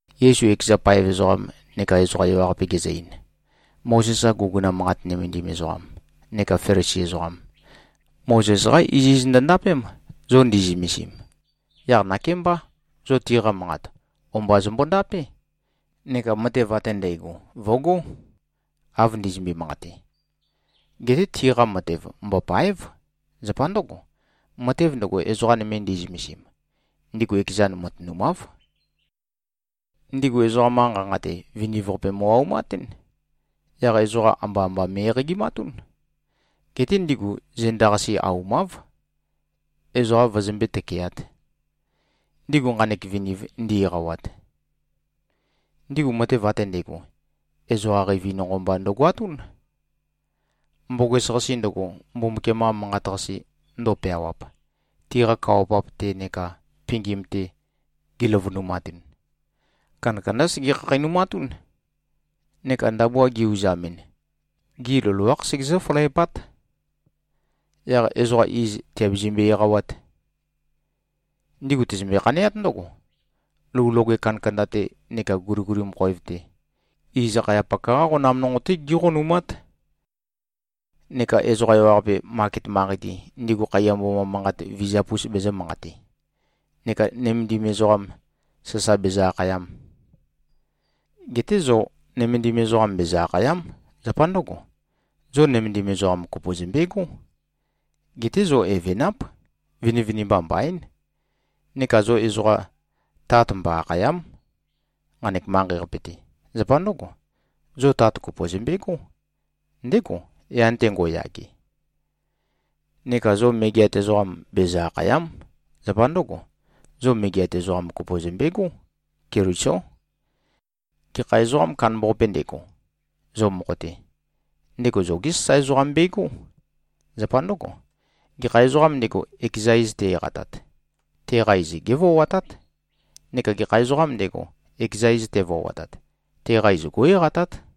Yesu ekeza paev ezoqam neka ezoqa ewaqape gezø-ein, “Mozes-qa guguna manqat nømendim ezoqam neka Felisi ezoqam, Mozes-qá iziz ndøndapém, zo ndi꞉zømesim. Yaq nakémbá, zo tiqa manqat, o-mba zømbo-ndapé, neka matev ate ndægo vø̀gó, av ndizømbe-manqate! Geté tiqa matev mbòpa᷄ev. Zapa ndǿgo, matev ndøgo, ezoqa nøme ndi꞉zømesim, ndigu ekezan matønumáv. Ndigu ezoqam-qa nqanqa-te, viniv-qape mo꞉-aumatún. Yaq ezoqa amba-amba me꞉-eqagimatún. Geté ndigu zenda-qase aumáv, ezoqa vøzømbé-tøkeāt, ndigu nqanek viniv ndi-eqawat. Ndigu matev ate ndægo, ezoqa qeivi nonqo mba ndøgoatún. Mboges-qase ndøgo, Mbumbukiam-qa Manqat-qase ndøu-peawap, tiqa kawa-pap-te neka pingim-te giløvønumatun, kandakandá sege-khakheinumatún, neka ndabua gi-uzamɨn, gi loloákh segezǿ-følæpát. Yaq ezoqa iz tìabezømbe-eqawát. Ndigu tøzømbe-khaneát ndǿgo, lou loge kandakanda-te neka guliguli khoev-te, iz akhayapak-qá qonam nonqo-té gíqonumát, neka ezoqa ewaqape, maket manqei-te, ndigu khaiya mboma manqat vizap-us bezø̄-manqate, neka ‘nømendim ezoqam’ sasa bezø-akhayam. Geté zo, ‘nømendim ezoqam’ bezø-akhàya᷄m. Zapa ndǿgo, zo nømendim ezoqa kopo zømbegó. Geté zo evenáp. Vinivinimba mbaín. Neka zo ezoqa ‘Tat’ mbo-akhàya᷄m, nqanek manqei-qape-te. Zapa ndǿgo, zo tat kopo zømbegó. Ndégo, yan-te ngo꞉yage. Neka zo ‘megeat ezoqam’ bezø-akhàya᷄m. Zapa ndǿgo, zo megeat ezoqam kopo zømbegó. Kelisó. Gekha ezoqām kandambaqape ndego, zo mokho-te, ndego zogé sasae ezoqam begó. Zapa ndǿgo, gekha ezoqām ndego, ekeza iz te-eqatat, teqa iz gévoatát. Neka gekha ezoqām ndego, ekeza iz tevoatat, teqa iz gó꞉-eqatát.”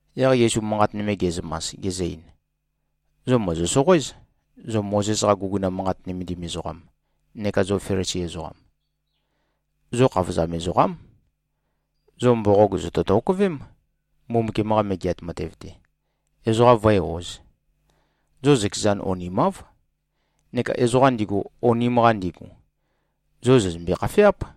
Yaq Yesu manqat nøme ge꞉zømas, gezø-ein, “Zo mòzo-soqoéz, zo Mozes-qa guguna manqat nømendim ezoqam neka zo Felisi ezoqam. Zo khavozam ezoqám. Zo mboqog, zòto-tokøvém, Mbumbukiam-qa Megeat Matev-te, ezoqa vǿe-ōz. Zo zøkezan onimáv. Neka ezoqam ndigu, onim-qa ndigu, zo zòzømbe-khafeáp.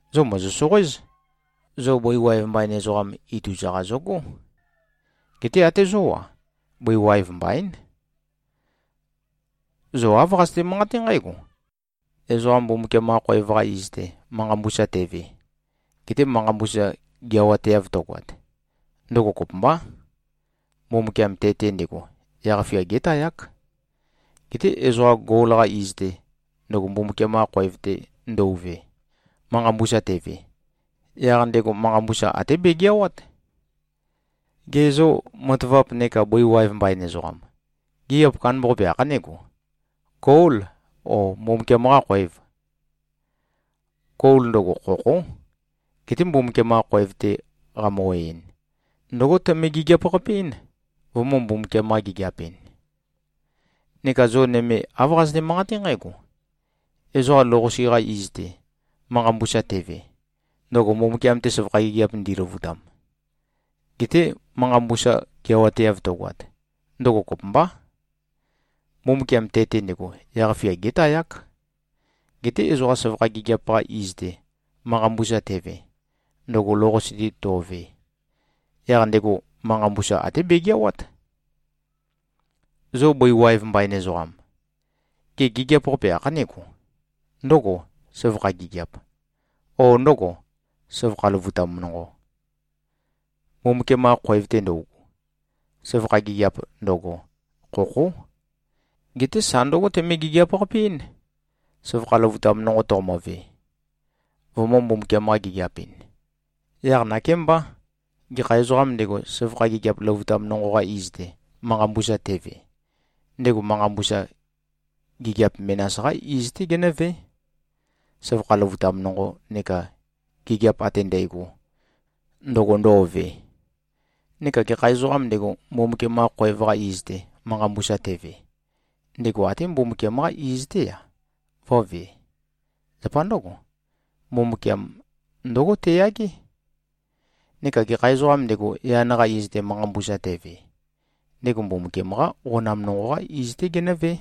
Zo mòzo-soqoéz. Zo bøi waev mbain ezoqam, ituza-qa zogó. Geté até zó-a, bøi waev mbaín. Zo āv qazøte-manqaté nqǽgo, ‘Ezoqa Mbumbukiam-qa khoev-qa iz-te, manqa mbusa teve, gete manqa mbusa geawateav tøgoat, ndøgo kopømbá. Mbumbukiam te-te ndego yaq-fia gétayák. Geté ezoqa gol-qa iz-te, ndøgo Mbumbukiam-qa khoev-te ndøuve, manqa mbusa teve, yaq ndego manqa mbusa até begeawát.’ Ge zô, matavap neka bøi waev mbain ezoqam, gigiap kandambaqape ākhanégo? Gôl, ó, Mbumbukiam-qâ khòev? Gol, ndøgo khokhó. Geté Mbumbukiam-qa khoev-te qamø-oeɨn, ndǿgo tøme-gigiap-qape-ɨ́n, vømø̄-Mbumbukiam-qa-gigiap-ɨn. Neka zo nøme, āv qazøte-manqaté nqǽgo, ‘Ezoqa lou-qase-qa iz-te, manqa mbusa teve, ndøgo Mbumbukiam-te søvakha gigiap ndiløvutam, gete manqa mbusa geawateav tøgoat, ndøgo kopømbá. Mbumbukiam te-te ndego yaq-fia gétayák. Geté ezoqa søvakha gigiap-qa iz-te, manqa mbusa teve, ndøgo lou-qase-te to꞉ve, yaq ndego manqa mbusa até begeawát.’ Zo bøi waev mbain ezoqam, gê, gigiap kandambaqape ākhanégo? Ndǿgò, søvakha gigiâp, o ndǿgò, søvakha løvutam nonqo, Mbumbukiam-qa khoev-te ndøugu? Søvakha gigiap ndøgo, khokhó. Geté sa ndǿgo, tøme-gigiap-qape-ɨ́n, søvakha løvutam nonqo toqomo꞉ve, vømø̄-Mbumbukiam-qa-gigiap-ɨn. Yaq nakémbá. Gekha ezoqām ndego, søvakha gigiap løvutam nonqo-qa iz-te, manqa mbusa teve, ndego manqa mbusa, gigiap menas-qá iz-té genǿvé, søvakha løvutam nonqo neka gigiap ate ndægo, ndøgo ndo꞉ve. Neka gekha ezoqām ndego, Mbumbukiam-qa khoev-qa iz-te, manqa mbusa teve, ndego até Mbumbukiam-qá iz-té-a, vǿvē. Zapa ndǿgo, Mbumbukiam ndǿgo teyagé. Neka gekha ezoqām ndego, yan-qa iz-te, manqa mbusa teve, ndego Mbumbukiam-qá qonam nonqo-qá iz-té genǿvé.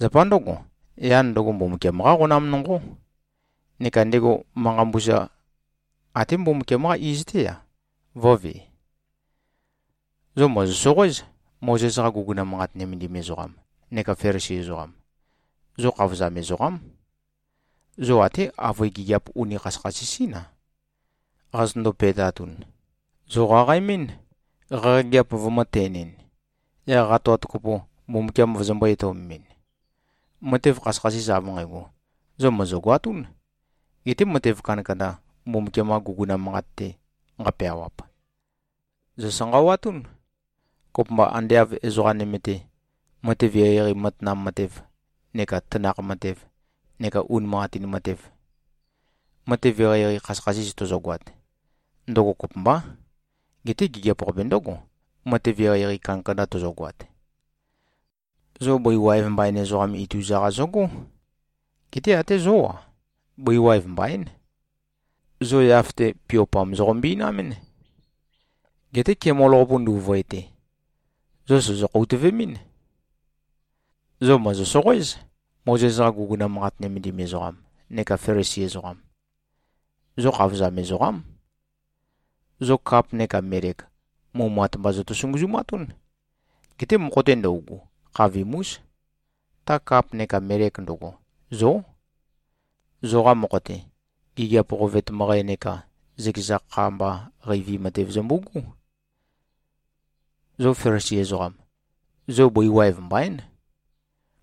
Zapa ndǿgo, yan ndøgo, Mbumbukiam-qá qonam nonqó. Neka ndego, manqa mbusa, até Mbumbukiam-qá iz-té-a, vǿvē. Zo mòzo-soqoéz, Mozes-qa guguna manqat nømendim ezoqam neka Felisi ezoqam. Zo khavozam ezoqám. Zo até avøe gigiap uni khasøkhasis-ín-a, qazøtøndo-pe꞉tatun, zòqaqaemɨ́n, qaqageap vømø̄-ten-ɨn, yaq qatoat kopo, Mbumbukiam vozombō-etøomemɨn. Matev khasøkhasis av nqægo, zo mòzogoatún. Geté matev kandakanda, Mbumbukiam-qa guguna manqat-te nqapeawap, zòsanqawatún, kopømba ande av ezoqa nøme-te, matev eqeieqei matanam matev, neka tanakh matev, neka unimanqatin matev. Matev eqeieqei khasøkhasis tozogoat, ndøgo kopømbá. Geté gigiap-qape ndǿgo, matev eqeieqei kandakanda tozogoat. Zo bøi waev mbain ezoqam, ituza-qa zøgó. Geté até zó-a, bøi waev mbaín. Zo yaf-te, piopam zoqombinamɨ́n. Geté kemol-qapu ndu꞉vøete, zo sòzo-khoutøve꞉mɨ́n. Zo mòzo-soqoéz, Mozes-qa guguna manqat nømendim ezoqam neka Felisi ezoqam. Zo khavozam ezoqám. Zo kap neka melek, mumat mba zoto-sunguzumatún. Geté mokho-te ndøugu, khavim-ús. Ta kap neka melek ndøgo, zó. Zoqa mokho-te, gigiap qovet møqæ neka zøkeza kha mba qeivi matev zømbu꞉gú. Zo Felisi ezoqam, zo bøi waev mbaín.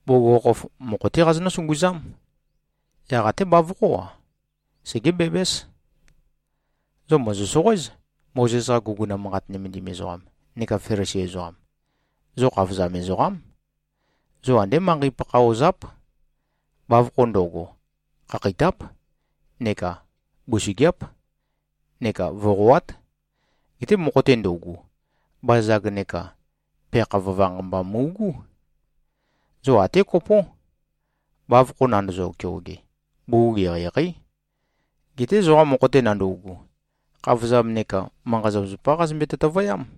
Bugukhokhof, mokho-té qazonǿ-sunguzám. Yaq até bavokhó-a, segébæbǽs. Zo mòzo-soqoéz, Mozes-qa guguna manqat nømendim ezoqam neka Felisi ezoqam. Zo khavozam ezoqám. Zo andé manqei-pakha ozáp. Bavokho ndo꞉go, khakheitáp neka busøgeáp neka voqoát. Geté mokho-te ndøugu, bazag neka peakha vøvanq mba mu꞉gú. Zo até kopó. Bavokho nandozo-keoge, bugug eqeieqeí. Geté zoqa mokho-te nandøugu, khavozam neka manqa-zapazapá qazømbe-tøtøvøyám.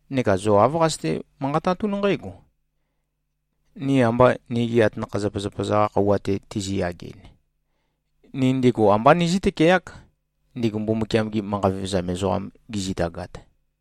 Neka zo āv qazøte-manqatatún nqǽgo, ‘Ni amba nigi atanakha-zapazapa-za-qa khøuwa-te tizi-yageɨn, ni ndigu ambá nizǿ-tøkeák, ndigu Mbumbukiam-gi manqa vevezam ezoqam gizitagat.’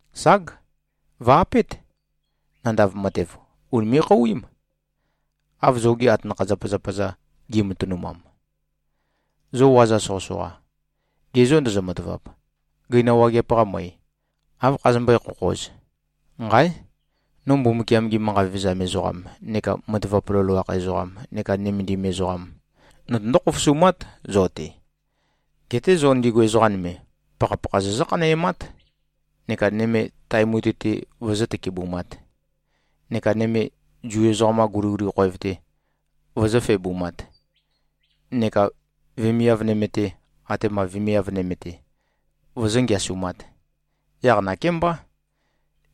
Ság. Vø̀-apét. Nandav matev, ùnime꞉-khouím, av zogi atanakha-zapazapa-za gi꞉matønumam. Zo waza soqøsoqa. Ge zô ndozo-matavap, gøina wageap-qa møe, áv khazømbøé-khokhōz? Nqáe! No Mbumbukiam-gi manqa vevezam ezoqam neka matavap loloakh ezoqam neka nømendim ezoqam notøndó-khofosumát, zo-te. Geté zo ndigu ezoqa nøme, pakhapakha zozǿ-khanæmát, neka nøme tae mutui-te vozó-tøkebumāt, neka nøme Zu ezoqam-qa guliguli khoev-te vozó-febumāt, neka vemiav nøme-te atema vemiav nøme-te vozó-ngeasumāt. Yaq nakémbá,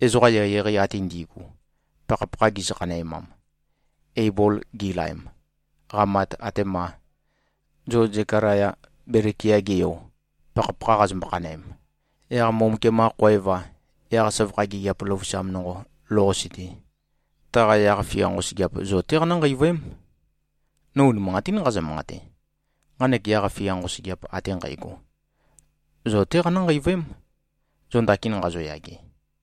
ezoqa eqeieqei ate ndi꞉gu, pakhapakha gizø-khanæmam, Eibol gilaem, qamat, atema zo Zekalaya, Belekia-ge yo, pakhapakha qazombo-khanøem, yaq Mbumbukiam-qa khoev-a, yaq søvakha gigiap løvusam nonqo lou-qase-te, taqa yaq-fia nqosøgeap zo-té qanǿ-nqeivøém. No unimanqatín nqazø-manqate: Nqanek yaq-fia nqosøgeap ate nqægo, zo-té qanǿ-nqeivøém, zo ndakin nqazoyage.”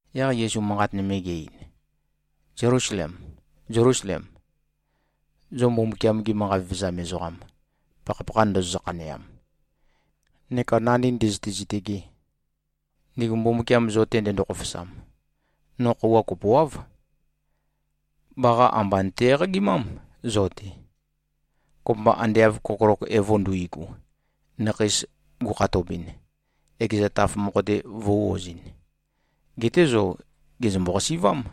Yaq Yesu manqat nøme ge-ein, “Zelusalem, Zelusalem, zo Mbumbukiam-gi manqa vevezam ezoqam, pakhapakha ndozozø-khaneam, neka nandī ndø̄zø̄tē-zītø̄gē, ndigu Mbumbukiam zo-te ndendo-khofosam, no khøuwa kopoáv, baqa amba nøte-eqagimám zo-te, kopømba ande av kokolok evo nduigu, nakheis gukhatobɨn, ekeza taf mokho-te vø̄-ozɨn. Geté zo gèzømbo-qasi꞉vám.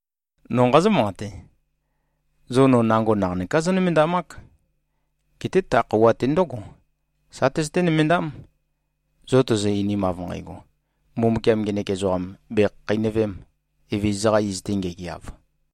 No nqazǿ-manqate: Zo no nango naqanøká zónømendamák. Geté ta khøuwa-te ndǿgo, sa tøzøté-nømendám, zo tozo-einim, av nqægo, ‘Mbumbukiam ngenek ezoqam bèkhakheinøvém, Evezøza-qa iz-te ngegeav!’”